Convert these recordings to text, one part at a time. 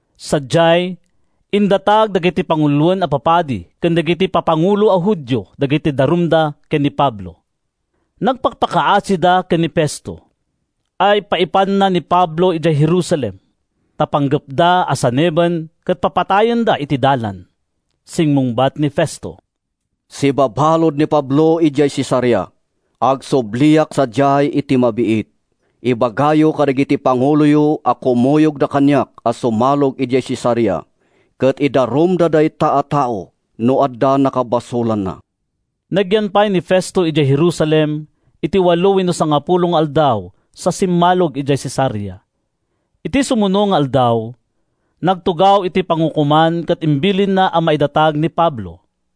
Sadiay, indatag dagiti panguloen a papadi ken dagiti papangulo a Judio dagiti darumda ken ni Pablo. Nagpakpakaasida ken ni Festo a paipanna ni Pablo idiay Jerusalem, ta panggepda a saneben ket papatayenda iti dalan. Simmungbat ni Festo: “Sibabalud ni Pablo idiay Cesarea. Agsubliak sadiay iti mabiit. Ibagayo kadagiti panguloyo a kumuyogda kaniak a sumalog idiay Cesarea ket idarumda dayta a tao no adda nakabasolanna.” Nagyan pay ni Festo idiay Jerusalem iti walo wenno sangapulo nga aldaw sa simmalog idiay Cesarea. Iti sumuno nga aldaw, nagtugaw iti pangukoman ket imbilinna a maidatag ni Pablo.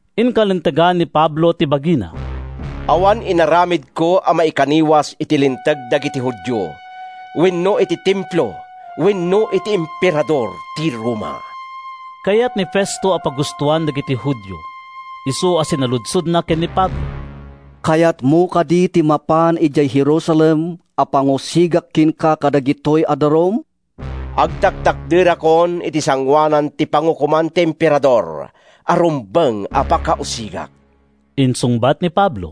Inkalintegan ni Pablo ti bagina: “Awan inaramidko a maikaniwas iti Linteg dagiti Judio wenno iti Templo wenno iti Emperador ti Roma.” Kayat ni Festo a pagustoan dagiti Judio, isu a sinaludsodna ken ni Pablo, “Kayatmo kadi ti mapan idiay Jerusalem a pangusigak kenka kadagitoy a darum?” “Agtaktakderakon iti sangoanan ti pangukoman ti Emperador a rumbeng a pakausigak,” insungbat ni Pablo.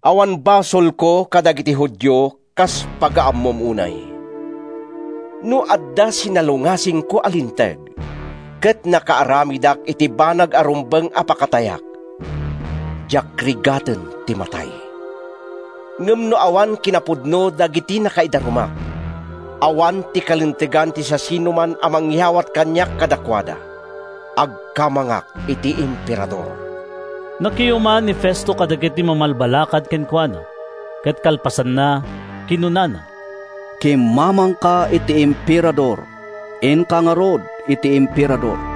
“Awan basolko kadagiti Judio kas pagaammom unay. No adda sinalungasingko a linteg, ket nakaaramidak iti banag a rumbeng a pakatayak, diak rigaten ti matay. Ngem no awan kinapudno dagiti nakaidarumak, awan ti kalintegan ti siasinoman a mangyawat kaniak kadakuada. Agkamangak iti Emperador.” Nakiuman ni Festo kadagiti mamalbalakad kenkuana, ket kalpasanna, kinunana, “Kimmamangka iti Emperador. Inka ngarud iti Emperador.”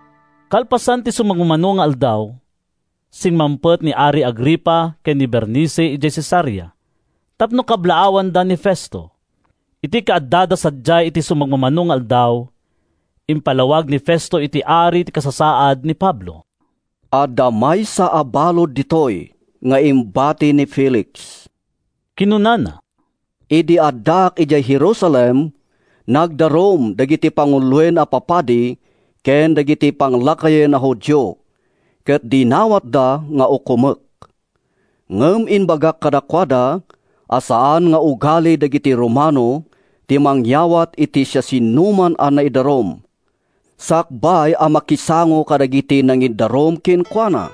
Kalpasan ti sumagmamano nga aldaw, simmangpet ni Ari Agripa ken ni Bernice idiay Cesarea tapno kablaawanda ni Festo. Iti kaaddada sadiay iti sumagmamano nga aldaw, impalawag ni Festo iti ari ti kasasaad ni Pablo. “Adda maysa a balud ditoy nga imbati ni Felix,” kinunana. “Idi addaak idiay Jerusalem, nagdarum dagiti panguloen a papadi ken dagiti panglakayen a Judio ket dinawatda nga ukomek. Ngem imbagak kadakuada a saan nga ugali dagiti Romano ti mangyawat iti siasinoman a naidarum sakbay a makisango kadagiti nangidarum kenkuana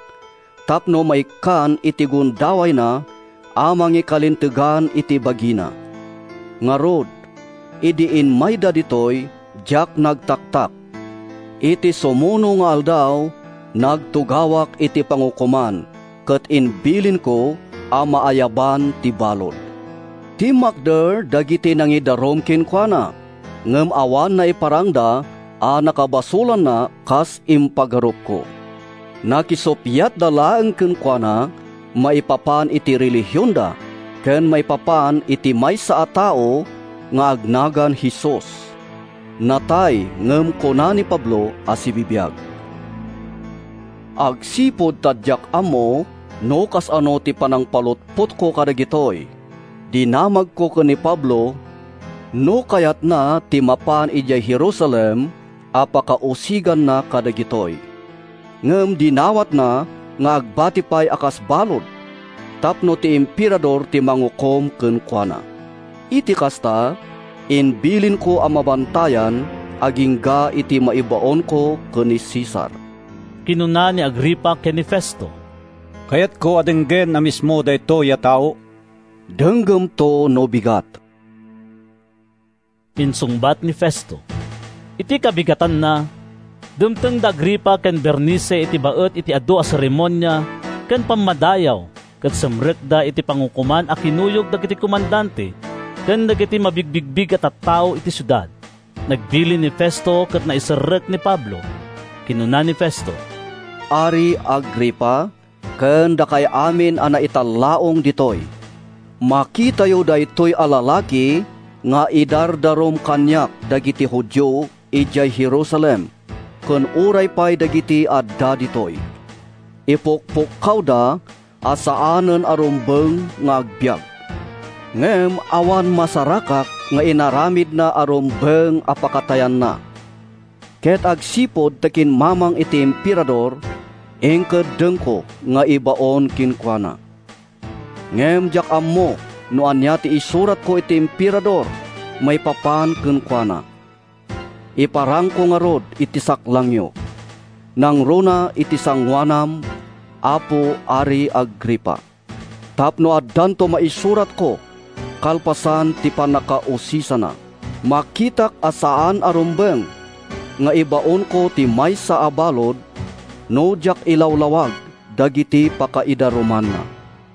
tapno maikkan iti gundawayna a mangikalintegan iti bagina. Ngarud, idi immayda ditoy, diak nagtaktak. Iti sumuno nga aldaw, nagtugawak iti pangukoman ket imbilinko a maayaban ti balud. Timmakder dagiti nangidarum kenkuana ngem awan naiparangda a nakabasolanna a kas impagarupko. Nakisuppiatda laeng kenkuana maipapan iti relihionda ken maipapan iti maysa a tao nga agnagan Jesus; natay ngem kuna ni Pablo a sibibiag. Agsipud ta diak ammo no kasano ti panangpalutpotko kadagitoy, dinamagko ken ni Pablo no kayatna ti mapan idiay Jerusalem a pakausiganna kadagitoy. Ngem dinawatna nga agbati pay a kas balud tapno ti Emperador ti mangukom kenkuana. Iti kasta, imbilinko a mabantayan agingga iti maibaonko ken ni Cesar.” Kinuna ni Agripa ken ni Festo, “Kayatko a denggen a mismo daytoy a tao.” “Denggemto no bigat,” insungbat ni Festo. Iti kabigatanna, dimteng da Agripa ken Bernice iti baet ti adu a seremonia ken pammadayaw ket simrekda iti pangukoman a kinuyog dagiti komandante ken dagiti mabigbigbig a tattao iti siudad. Nagbilin ni Festo ket naiserrek ni Pablo. Kinuna ni Festo, “Ari Agripa ken dakay amin a naitallaong ditoy: Makitayo daytoy a lalaki nga idardarum kaniak dagiti Judio idiay Jerusalem ken uray pay dagiti adda ditoy. Ipukpukkawda a saanen a rumbeng nga agbiag. Ngem awan masarakak nga inaramidna a rumbeng a pakatayanna. Ket agsipud ta kimmamang iti Emperador, inkeddengko nga ibaon kenkuana. Ngem diak ammo no ania ti isuratko iti Emperador maipapan kenkuana. Iparangko ngarud iti saklangyo, nangruna iti sangoanam, Apo Ari Agripa, tapno addanto maisuratko kalpasan ti pannakausisana. Makitak a saan a rumbeng nga ibaonko ti maysa a balud no diak ilawlawag dagiti pakaidarumanna.”